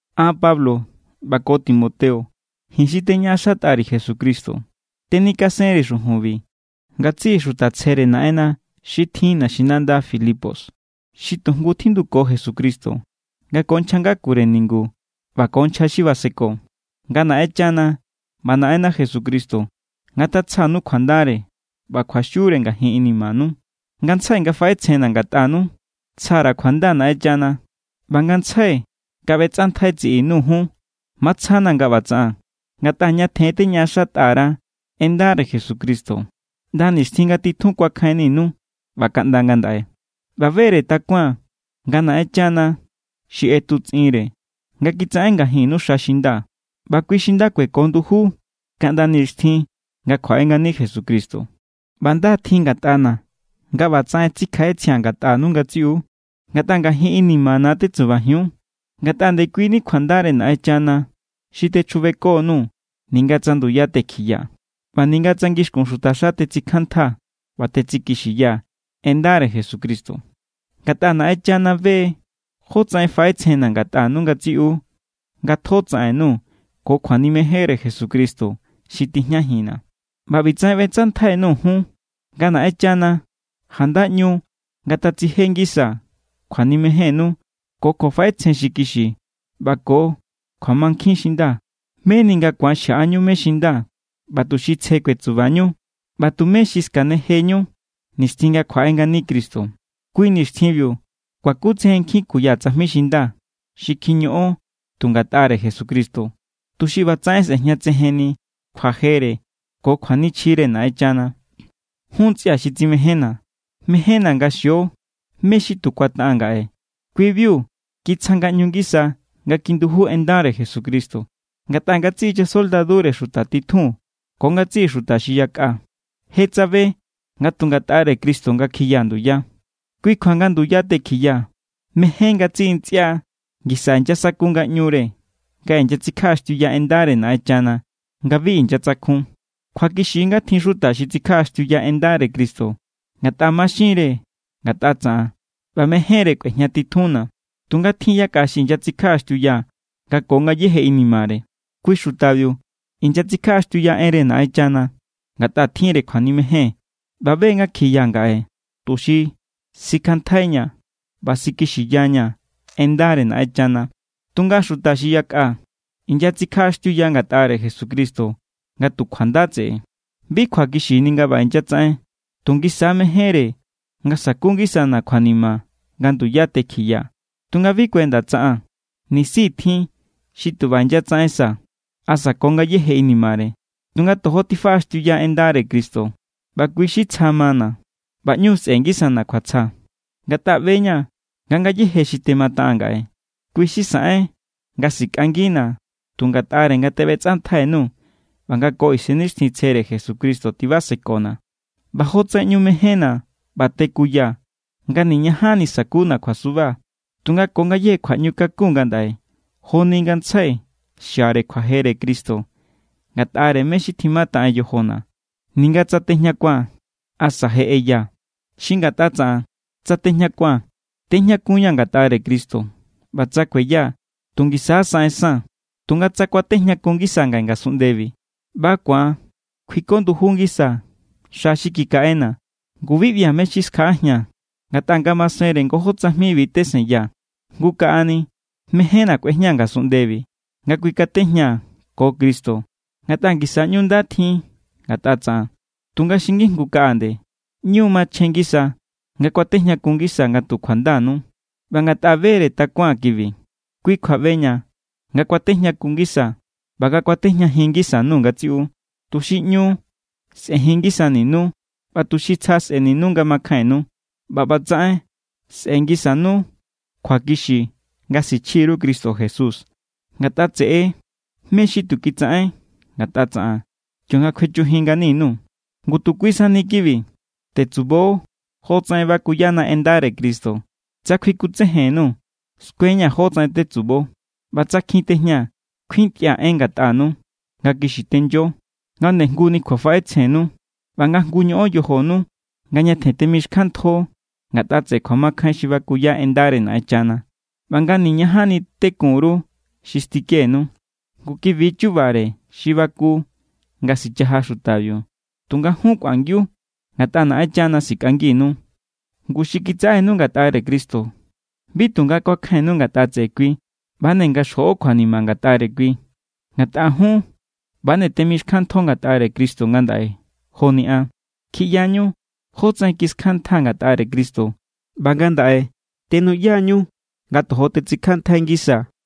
An, Pablo, ꞌba ko Timoteo, ji̱n xi teñaꞌaxatꞌa_ri̱ Jesucristo, tenikasenri̱ xujunbi ngatsiꞌi xuta tsjere Naꞌenna xi tjin naxinanda Filipos, xi tujngu tjinduko Jesucristo, nga ko nchja ngakure ningu ꞌba ko nchja xi baseko. Nga Naꞌenchana ꞌba Naꞌenna Jesucristo ngatatsjanu kjuandare ꞌba kjuaxiure ngajin inimanu. Ngantsjai nga faꞌetsjenna̱ ngatꞌanu, tsja_ra̱ kjuanda Naꞌenchana. ꞌBa ngantsjai nga ꞌbetsꞌantjai tsiꞌi_nuu̱ jun, matsjana̱ nga ꞌba tsaꞌaa̱n. Ngatꞌa ñatjen teñaꞌaxatꞌa_ra en ndare Jesucristo, ꞌnda nixtjin nga titjun kuakjainninu ꞌba kaꞌnda ngandaꞌe. ꞌBa bere takuaa̱n nga Naꞌenchana xi ꞌetutsꞌinre nga kitsaꞌen ngajinnu xa xi nda, ꞌba kui xi nda kueko nduju= kaꞌnda nixtjin nga kjuaꞌe ngani Jesucristo. ꞌBa nda tjin ngatꞌana̱ nga ꞌbatsaꞌen tsikjaꞌetsjia̱n ngatꞌanu ngatsiꞌu, ngatꞌa ngajin inimana̱ tetsubajiun. Ngatꞌa ndekuini kjuandare Naꞌenchana xi techjubekonuu̱ ninga tsa nduya tekjiyaa̱, ꞌba ninga tsa ngixkun xutaxa tetsikjanntjaa̱ ꞌba tetsikixiyaa̱ en ndare Jesucristo. Ngatꞌa Naꞌenchana be= jo tsaꞌen faꞌetsjenna̱ ngatꞌanu ngatsiꞌu nga tjo tsaꞌennu ko kjuanimejenre Jesucristo xi tijñajinna̱. ꞌBa ꞌbitsaꞌen ꞌbetsꞌantjai_nuu̱ jun: nga Naꞌenchana janda ꞌñu ngatatsije ngisa kjuanimejénnu ko kjuafaꞌetsjen xi kixi ꞌba ko kjuamankjin xi nda. Meni nga ku̱an xjaꞌajinñu mé= xi nda ꞌba tuxi tsje kuetsubañu ꞌba tumé xi skanejeñu nixtjin nga kjuaꞌe ngani Cristo. Kui nixtjinbiu kuakutsejen nkjin kuya tsajmi xi nda xi kjiñoꞌon tu ngatꞌare Jesucristo, tuxi ꞌbatsaꞌen sꞌejñatsejenni kjuajere ko kjuanichjire Naꞌenchana. Jun ntsꞌia̱ xi tsimejénna̱, mejénna̱ nga xio mé= xi tu kuataꞌaa̱n ngaꞌe, kui=biu kitsja ngaꞌñu ngisa nga kijinduju en ndare Jesucristo. Ngatꞌa ngatsiꞌi chasoldadure xuta titjun ko ngatsiꞌi xuta xi yakꞌa je tsabe nga tu ngatꞌare Cristo nga kjiyaa̱ nduya. Kui kjua nga nduya tekjiyaa̱, mején ngatsiꞌi ntsꞌia ngisa inyasaku ngaꞌñure nga inyatsikjaꞌaxtiuya en ndare Naꞌenchana nga bi inyatsakjun. Kjuakixi= nga tjin xuta xi tsikjaꞌaxtiuya en ndare Cristo ngatꞌa maxinre ngatꞌa tsaꞌan ꞌba mejénre kꞌuejñatitjunna̱. Tunga tjin= yakꞌa xi inyatsikjaꞌaxtiuya nga ko ngayéje inimare. Kui xutabiu inyatsikjaꞌaxtiuya enre Naꞌenchana ngatꞌa tjinre kjuanimejen ꞌba be nga kjiya ngaꞌe tuxi sikjanntjaiñaa̱ ꞌba sikixiyaña̱ en ndare Naꞌenchana. Tunga xuta xi yakꞌa, inyatsikjaꞌaxtiuya ngatꞌare Jesucristo nga tu kjuanda tseꞌe. Bi kjuakixini nga ꞌba inyatsaꞌen, tu ngisa= mejénre nga saku ngisana̱ kjuanima nga nduya tekjiyaa̱. Tunga bi kuenda tsaꞌaa̱n. Nisi= tjin xi tu ꞌba inyatsaꞌen sa asa ko ngayéje inimare, tunga tojo tifaꞌaxtiuya en ndare Cristo, ꞌba kui= xi tsja= mana̱. ꞌBa ꞌñu sꞌe̱ngisana̱ kjuatsja. Ngatꞌa ꞌbe=ña̱ nga ngayéje xi temataꞌaa̱n ngaꞌe, kui xi saꞌen nga sikꞌangina̱ tu ngatꞌare nga teꞌbetsꞌantjainuu̱ ꞌba nga ko Isennixtjintsjere Jesucristo tibasekona̱. ꞌBa jotsaꞌen ꞌñu mejénna̱ ꞌba tekuyaa̱ nga niñajanni sa̱kuna̱ kjuasuba. Tunga ko ngayéje kjuaꞌñukakun ngandaꞌe joni ngantsjai xiare kjuajere Cristo ngatꞌare mé= xi tjimataꞌen yojona̱, ninga tsa tejñakua̱n asa tsa je ꞌeyaa̱. Xi ngatꞌa tsaꞌan, tsa tejñakua̱n, tejñakunñaa̱ ngatꞌare Cristo. ꞌBa tsa kueyaa̱, tu ngisa= saꞌensaa̱n. Tunga tsa ku̱atejñakun ngisaa̱ ngaꞌe ngasunꞌndebi ꞌba ku̱an kuiko nduju ngisaa̱ xa xi kikaꞌena̱, ngu bi ꞌbia̱ mé= xi skjaꞌajia̱n. Ngatꞌa nga masenre ngojó tsajmibi tesenyaa̱. Jngu kaꞌani, mejénna̱ kꞌuejñaa̱ ngasunꞌndebi nga kuikatejñaa̱ ko Cristo, ngatꞌa ngisa= ꞌñu nda tjin ngatꞌa tsaꞌan. Tunga xi ngijngu kaꞌa nde, ꞌñu= machjen ngisa nga ku̱atejñakun ngisaa̱ nga tu kjuandanu. ꞌBa ngatꞌa bere takuaa̱n kibi, kui kjua ꞌbeña̱ nga ku̱atejñakun ngisaa̱ ꞌba nga kuatejñajin ngisa_nuu̱ ngatsiꞌu, tuxi ꞌñu sꞌe̱jin ngisaninu ꞌba tuxi tsja sꞌe̱ninu nga makjainnu. ꞌBa ꞌbatsaꞌen, sꞌe̱ngisanu kjuakixi nga sichji_ru Cristo Jesús ngatꞌa tseꞌe mé= xi tu kitsaꞌen ngatꞌa tsaꞌan kionga kjuechujin ngani_nuu̱. Ngu tu kui sani kibi: tetsubo jotsaꞌen bakuyana en ndare Cristo. Tsa kjuikutsejen_nuu̱, skueñaa̱ jótsaꞌen tetsubo. ꞌBa tsa kjin tejñaa̱, kuintꞌia̱ en ngatꞌanu, nga kixi tenyo, nga ndejnguni kjuafaꞌetsjennu, ꞌba nga jngu ñoꞌon yojonu nga ñatjen temixkjanntjo ngatꞌa tseꞌe kjuamakjain xi bakuya en ndare Naꞌenchana, ꞌba nga niñajanni tekun_ru xi stikenu. Ngu kibi= chubare xi baku nga sichaja xutabiu, tunga jun kꞌuangiu ngatꞌa Naꞌenchana sikꞌanginu. Ngu xi kitsaꞌenu ngatꞌare Cristo bi tu nga ku̱akjainnu ngatꞌa tseꞌe kui, ꞌba=nde nga xjoꞌo kjuanima ngatꞌare kui. Ngatꞌa jun ꞌba=nde temixkjanntjo ngatꞌare Cristo ngandaꞌe joni an. Kjiꞌyañu jotsaꞌen kiskjanntjaa̱ ngatꞌare Cristo ꞌba ngandaꞌe tenuꞌyañu nga tojo tetsikjanntjai ngisaa̱.